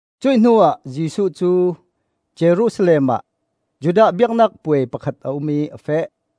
Cuih hnuah Jesuh cu Jerusalem ah Judah biaknak puai pakhat a um ih a feh.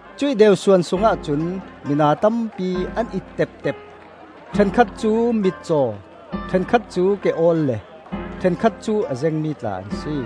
Cuih deusuan sungah cun mina tampi an it teptep. Ṭhenkhat cu mitcaw, ṭhenkhat cu ke-awl le ṭhenkhat cu a zengmi tla an si.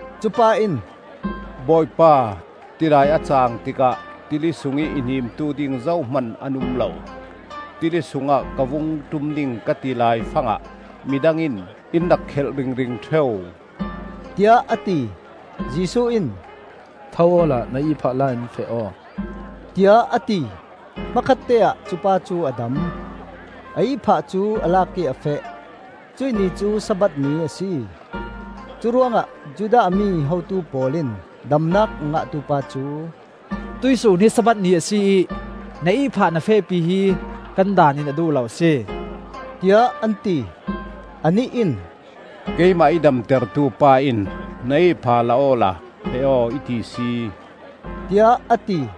Cupa in, “Bawipa, tidai a caang tikah tili sungih i hnimtu ding zohman an um lo. Tili sungah ka vung ṭum ding ka ti laifangah midang in in rak khelh ringring ṭheu,” tiah a ti. Jesuh in, “Tho awla na ihphah la in feh aw,” tiah a ti. Hmakhatteah cupa cu a dam; a ihphah cu a lak ih a feh. Cuih ni cu Sabbath ni a si. Curuangah Judah mi hotu pawl in damnak a ngahtu pa cu, “Tuih sun hi Sabbath ni a si ih na ihphah na fehpi hi kan Daan in a duh lo a si,” tiah an ti. Anih in, “Keimah i damtertu pa in na ihphah la awla feh aw, i ti si!” tiah a ti.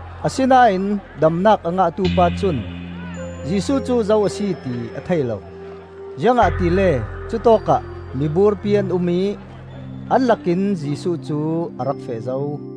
Asinain damnak a ngahtu pa cun Jesuh cu zo a si ti a thei lo, ziangahtile cutawkah miburpi an um ih an lakin Jesuh cu a rak feh zo.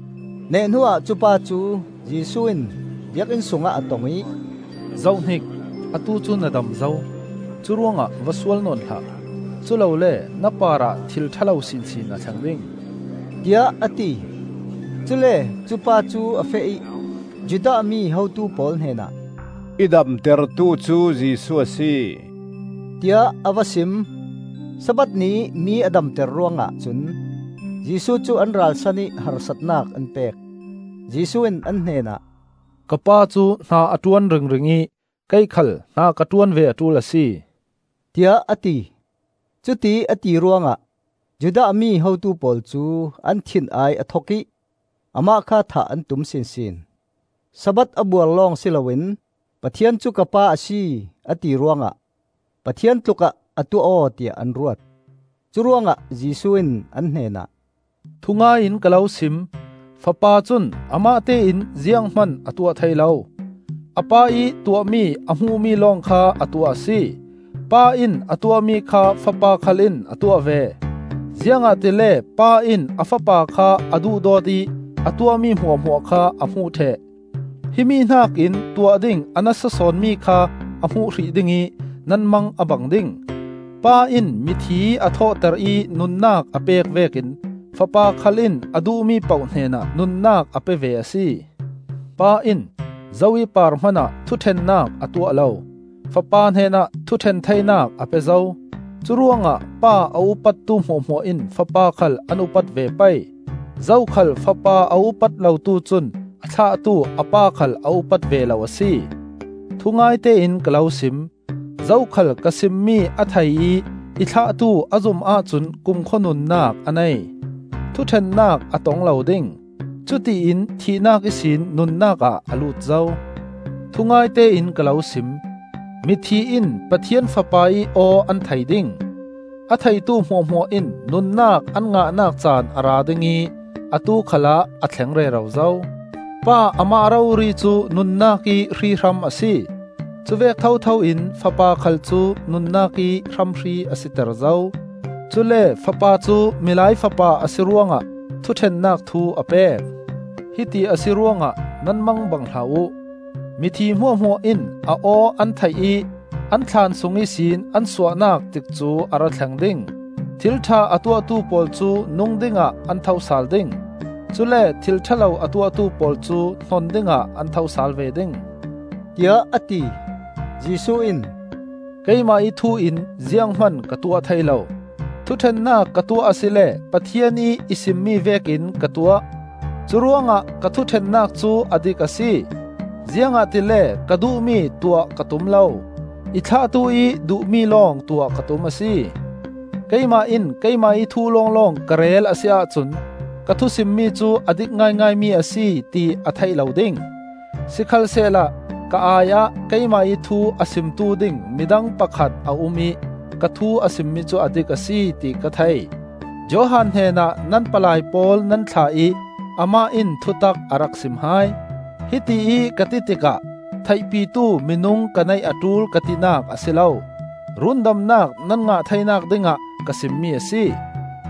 Neh hnuah cupa cu Jesuh in Biakinn sungah a tong ih, “Zohhnik! Atu cu na dam zo; curuangah va sual nawn hlah. Culole na parah thil ṭha lo sinsin a thleng ding,” tiah a ti. Cule cupa cu a feh ih Judah mi hotu pawl hnenah, “I damtertu cu Jesuh a si,” tiah a va sim. Sabbath ni ih mi a damter ruangah cun Jesuh cu an ralsan ih harsatnak an pek. Jesuh in an hnenah, “Ka pa cu hna a ṭuan ringring ih kei khal hna ka ṭuan ve a ṭul a si,” tiah a ti. Cutiih a ti ruangah Judah mi hotu pawl cu an thin-ai a thok ih amah kha thah an tum sinsin; Sabbath a buar lawng si loin Pathian cu ka Pa a si, a ti ruangah Pathian tlukah a tuah aw tiah an ruat. Curuangah Jesuh in an hnenah, “Thungai in ka lo sim: Fapa cun amah tein zianghman a tuah thei lo. A Pa ih tuahmi a hmuhmi lawng kha a tuah a si. Pa in a tuahmi kha Fapa khal in a tuah ve. Ziangahtile Pa in a Fapa kha a duhdawt ih a tuahmi hmuahhmuah kha a hmuh ṭheh. Himi hnakin tuah ding a nasa sawn mi kha a hmuh hrih ding ih nan mang a bang ding. Pa in mithi a thawhter ih nunnak a pek vekin Fapa khal in a duhmi poh hnenah nunnak a pe ve a si. Pa in zo ih par hmanah thuṭhennak a tuah lo. Fapa hnenah thuṭhen theinak a pe zo. Curuangah Pa a upattu hmuahhmuah in Fapa khal an upat ve pei. Zokhal Fapa a upat lotu cun a thlahtu a Pa khal a upat ve lo a si. Thungaite in ka lo sim: zokhal ka simmi a thei ih i thlahtu a zum ahcun kumkhua nunnak a nei. Thuṭhennak a tong lo ding; cutiin thihnak ihsin nunnak ah a lut zo. Thungaite in ka lo sim: mithi in Pathian Fapa ih aw an thei ding; a theitu hmuahhmuah in nunnak an ngahnak caan a ra ding ih atu khalah a thleng rero zo. Pa amah rori cu nunnak ih hrihram a si; cuvek thotho in Fapa khal cu nunnak ih hramhri a siter zo. Cule Fapa cu Milai Fapa a si ruangah thuṭhennak thu a pek. Hiti a si ruangah nan mangbang hlah uh; mithi hmuahhmuah in a aw an theih ih, an thlaan sung ihsin an suahnak tikcu a ra thleng ding: thil ṭha a tuahtu pawl cu nung dingah an tho sal ding; cule thil ṭha lo a tuahtu pawl cu hnon dingah an tho sal ve ding,” tiah a ti. Jesuh in, “Keimah ih thu in zianghman ka tuah thei lo. Thuṭhennak ka tuah asile Pathian ih i simmi vekin ka tuah; curuangah ka thuṭhennak cu a dik a si, ziangahtile ka duhmi tuah ka tum lo, i thlahtu ih duhmi lawng tuah ka tum a si. Keimah in keimah ih thu lawng ka rel a si ahcun ka thusimmi cu a dik ngaingaimi a si, ti a theih lo ding. Sikhalsehla ka ai-ah keimah ih thu a simtu ding midang pakhat a um ih ka thu a simmi cu a dik a si, ti ka thei. Johan hnenah nan palai pawl nan thlah ih amah in thutak a rak sim hai. Hitiih ka ti tikah theihpitu minung ka neih a ṭul ka tinak a si lo; rundamnak nan ngah theinak dingah ka simmi a si.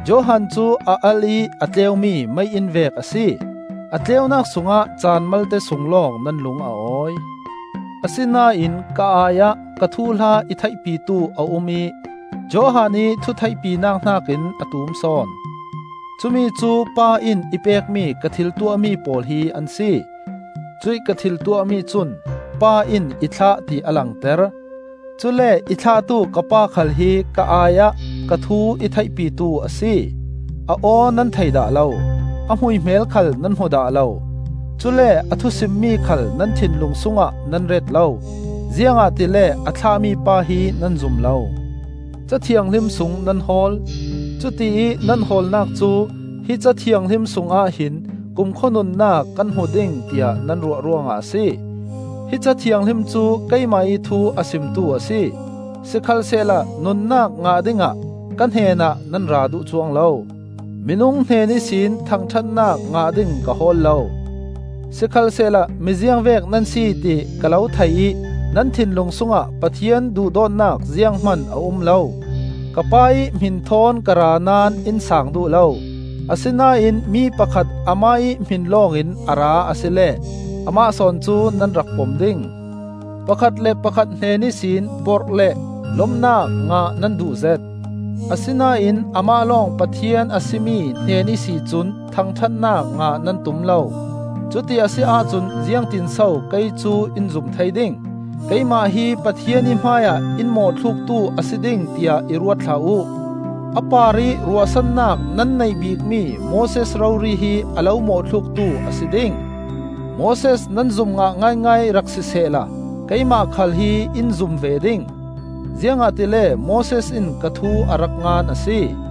Johan cu a alh ih a tleumi mei-inn vek a si; a tleunak sungah caan malte sung lawng nan lung a awi. Asinain ka ai-ah ka thuhla i theihpitu a um ih Johan ih thutheihpinak hnakin a tum sawn; cumicu Pa in i pekmi ka thil tuahmi pawl hi an si. Cuih ka thil tuahmi cun Pa in i thlah ti a langter. Cule i thlahtu ka Pa khal hi ka ai-ah ka thu i theihpitu a si. A aw nan thei dah lo, a hmuihmel khal nan hmu dah lo; cule a thu simmi khal nan thinlung sungah nan ret lo, ziangahtile a thlah mipa hi nan zum lo. Ca Thianghlim sung nan hawl; cutiih nan hawlnak cu hi Ca Thianghlim sungah hin kumkhua nunnak kan hmu ding, tiah nan ruah ruangah a si. Hi Ca Thianghlim cu keimah ih thu a simtu a si. Sikhalsehla nunnak ngah dingah ka hnenah nan ra duh cuang lo. Minung hnen ihsin thangṭhatnak ngah ding ka hawl lo. Sikhalsehla mi ziangvek nan si ti ka lo thei ih nan thinlung sungah Pathian duhdawtnak zianghman a um lo. Ka Pa ih hmin thawn ka ra naón in saang duh lo; asinain mi pakhat amah ih hmin lawng in a ra asile amah sawn cu nan rak pom ding. Pakhat le pakhat hnen ihsin porh le lomnak ngah nan duh zet, asinain amah lawng Pathian a si mi hnen ihsi cun thangṭhatnak ngah nan tum lo; cuti a si ahcun ziangtinso kei cu in zum thei ding? Keimah hi Pathian ih hmaiah in mawhthluktu a si ding, tiah i ruat hlah uh. A parih ruahsannak nan neih bikmi Moses rori hi a lo mawhthluktu a si ding. Moses nan zum ngah ngaingai rak sisehla keimah khal hi in zum ve ding; ziangahtile Moses in ka thu a rak ngan a si.